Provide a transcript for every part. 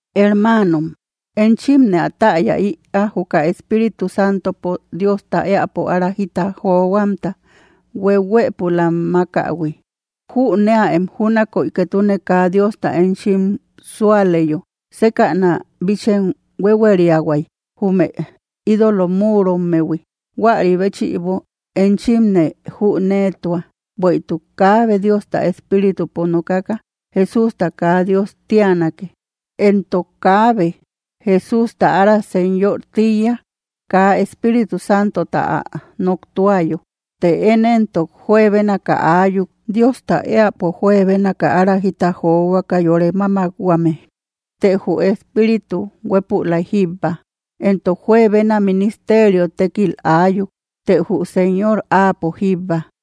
Hermanom, enchimne ä taaya ïa, juka Espíritu Santopo Diosta eapo ära jita johuamta huehuëpulam makähui. Jüneaem júnaköi ketune kaa Diosta enchim sauleyo, sekäna bíchem huéhueriahuay, jume ídolo muurommehui. Huäri béchïbo enchimne jünetua, bueïtuk kaabe Diosta Espíritupo nokaka: “Jesústa kaa Dios tianake.” Entok kaabe: “¡Jesústa ára Señor!”, tiïya kaa Espíritu Santota ä noktuayo. Të én entok juebénaka ayuk, Diosta eapo juebénaka ára jita johuaka yore máamakhuame, të jü Espíritu huépülay jíbba. Entok juebena ministerio tekkil ayuk, të jü Señor áapo jíbba.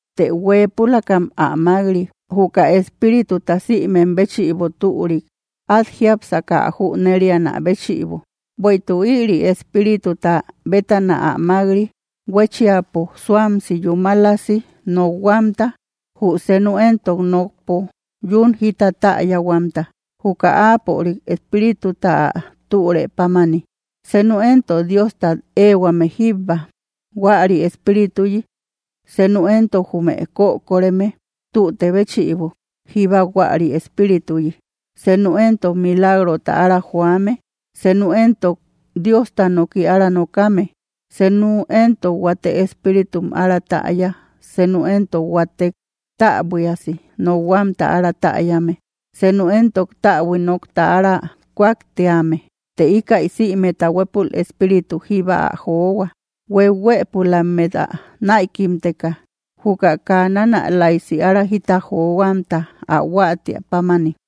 Të hueepülakam ä mak‑ri, juka Espírituta sïmem béchïbo türik. At jiápseka ä jünerianä béchïbo. Bueïtuk ïri Espírituta bétana ä mak‑ri huéchiapo suamsi yúmalasi nokhuamta, jü senu entok nokpo yún jita taayahuamta, juka áapörik Espírituta ä türe pámani. Senu entok, Diostat ehuame jíba huäri Espírituyi, senu entok jume kökoreme tüte béchïbo jíba huäri Espírituyi. Senu entok, milagrota ára joame, senu entok Diosta noki ára nokame, senu entok huate espíritum ára täya, senu entok huatek täbuiasi nokhuamta ára täyame, senu entok täbui nokta ára kuaktíame. Të ikaï sïmeta huepul Espíritu jíba ä johua, huehuëpulammet ä naïkimteka juka kaa nanalaysi ára jita johuamta, ä huatia pámani.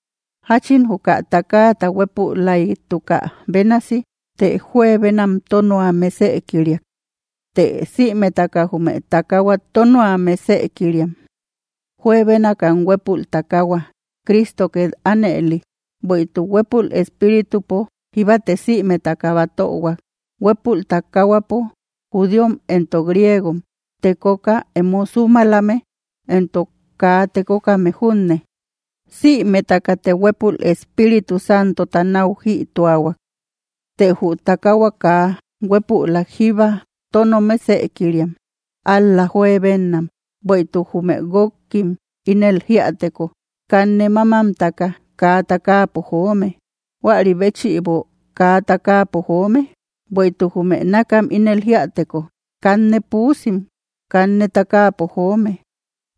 Jáchin juka tákaata huepülaitukä bénasi, të juebenam tónua mesëkiriak, të sïmetaka jume tákahuat tónua mesëkiriam, juebénakam huepul takahua, Crísto ket anëli. Bueïtuk huepul espíritupo jíbate sïmetaka batöhuak, huepul takahuapo, judíom entok griegom, tekoka emo sumalame entok kaa tekokame junne. Sïmetakate huepul Espíritu Santota nau jïtuahuak. Të jü takahua kaa huépülak jíba tónoa mesëkiriak, ál‑la juebennam. Bueïtuk jume guokkim ínel jíäteko: “Kanne mamamtaka, kaa tákaapo joome”, ¿jüarí béchïbo kaa tákaapo joome? Bueïtuk jume nakkam ínel jiäteko: “Kanne puusim, kanne tákapo joome”,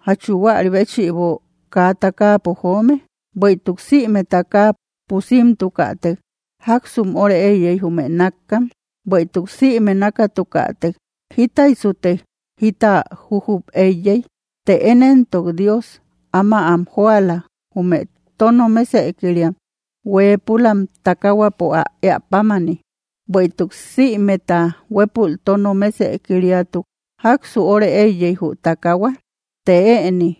¿jáchu juäri béchïbo kaa tákapo joome? Bueïtuk sïme tákaa pusimtukätek, ¿jaksum óre eíyey jume nakkam? Bueïtuk sïme nakamtukatek, ¿jítaysute jita jujup eíyey? Të én entok Dios, áma am joala jume tóno mesëkiriam, hueepulam takahuapo, ä eä pámani. Bueïtuk sïmeta huépül tóno mesëkiriatuk, ¿jaksu óre eiyey jü takahua? Të éni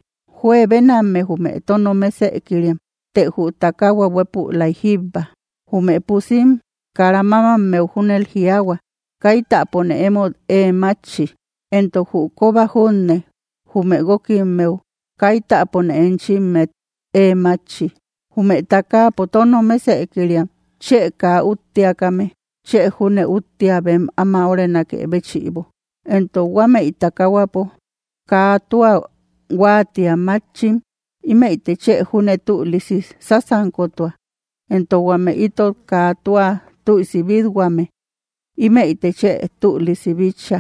juebenamme jume tóno mesëkiriam, të jü takahua huépülay jíbba. Jume pusim kara mamammeu júnel jiaahua: “Kaitäpone emót ée matchi”, entok jü koba junne jume guokimmeu: “Kaitäpone enchimmet ée matchi.” Jume tákapo tóno mesëkiriam, chë kaa ütteakame, chë júne üttia bem áma órenakë béchïbo. Entok huámeï takahuapo kaa tua huatia matchim, imeïte chë júne tülisi sasankotua, entok huame ítot kaa tua tüisi bitthuame, imeïte chë tülisi bitcha.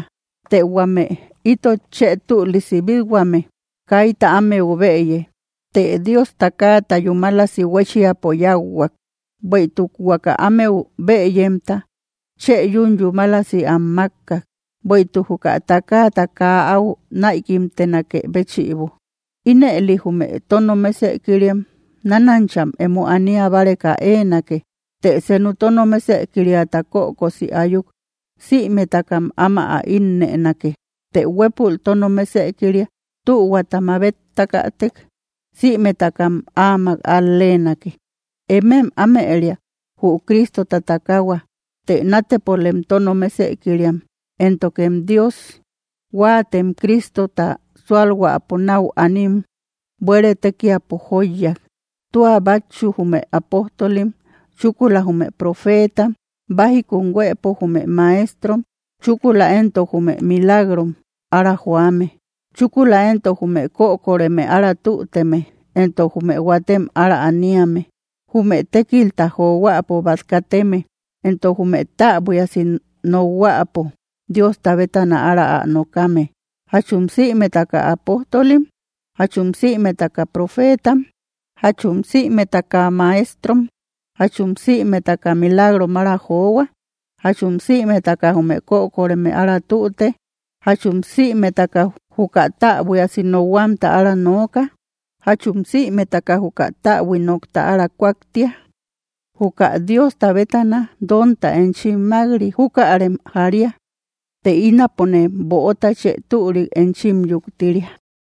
Të huame ítot chë tülisi bithuame, kayta ámeu bëye, të Dios tákaata yúmalasi huéchiapo yáahuak, bueïtuk huaka ámeu bëyemta chë yún yúmalasi am makkak. Bueïtuk juka tákaata kaa au naïkimtenakë béchïbo, ínëli jume tóno mesëkiriam, nanancham emo ania báareka eenake. Të senu tóno mesëkiriata kökosi ayuk, sïmetakam ámak ä innënake, të huepul tóno mesëkiria tühuata mabetakätek, sïmetakam ámak al‑lenake. Emem amëria, jü Cristota takahua, të natepolem tóno mesëkiriam. Entok Dios huatem Cristota sualhuäpo nau anim buere tekiapo joiyak, tua batchu jume apóstolim, chúkula jume profetam, bájikum huëpo jume maestrom, chúkula entok jume milagrom ára joame, chúkula entok jume kökoreme ára tutüteme, entok jume huatem ára aniame, jume tékilta johuäpo bat kateme, entok jume täbuiasi nokhuäpo Diosta bétana ára ä nokame. ¿Jachum sïmetaka apóstolim? ¿Jachum sïmetaka profetam? ¿Jachum sïmetakam maestrom? ¿Jachum sïmetaka milagrom ára johua? ¿Jachum sïmetaka jume kökoreme ára tüte? ¿Jachum sïmetaka juka täbuiasi nokhuamta ára nooka? ¿Jachum sïmetaka juka täbui nokta ára kuaktia? Juka Diosta bétana donta enchim mak‑ri, jukarem jária, të ínapone böota chë türik enchim yuktiria.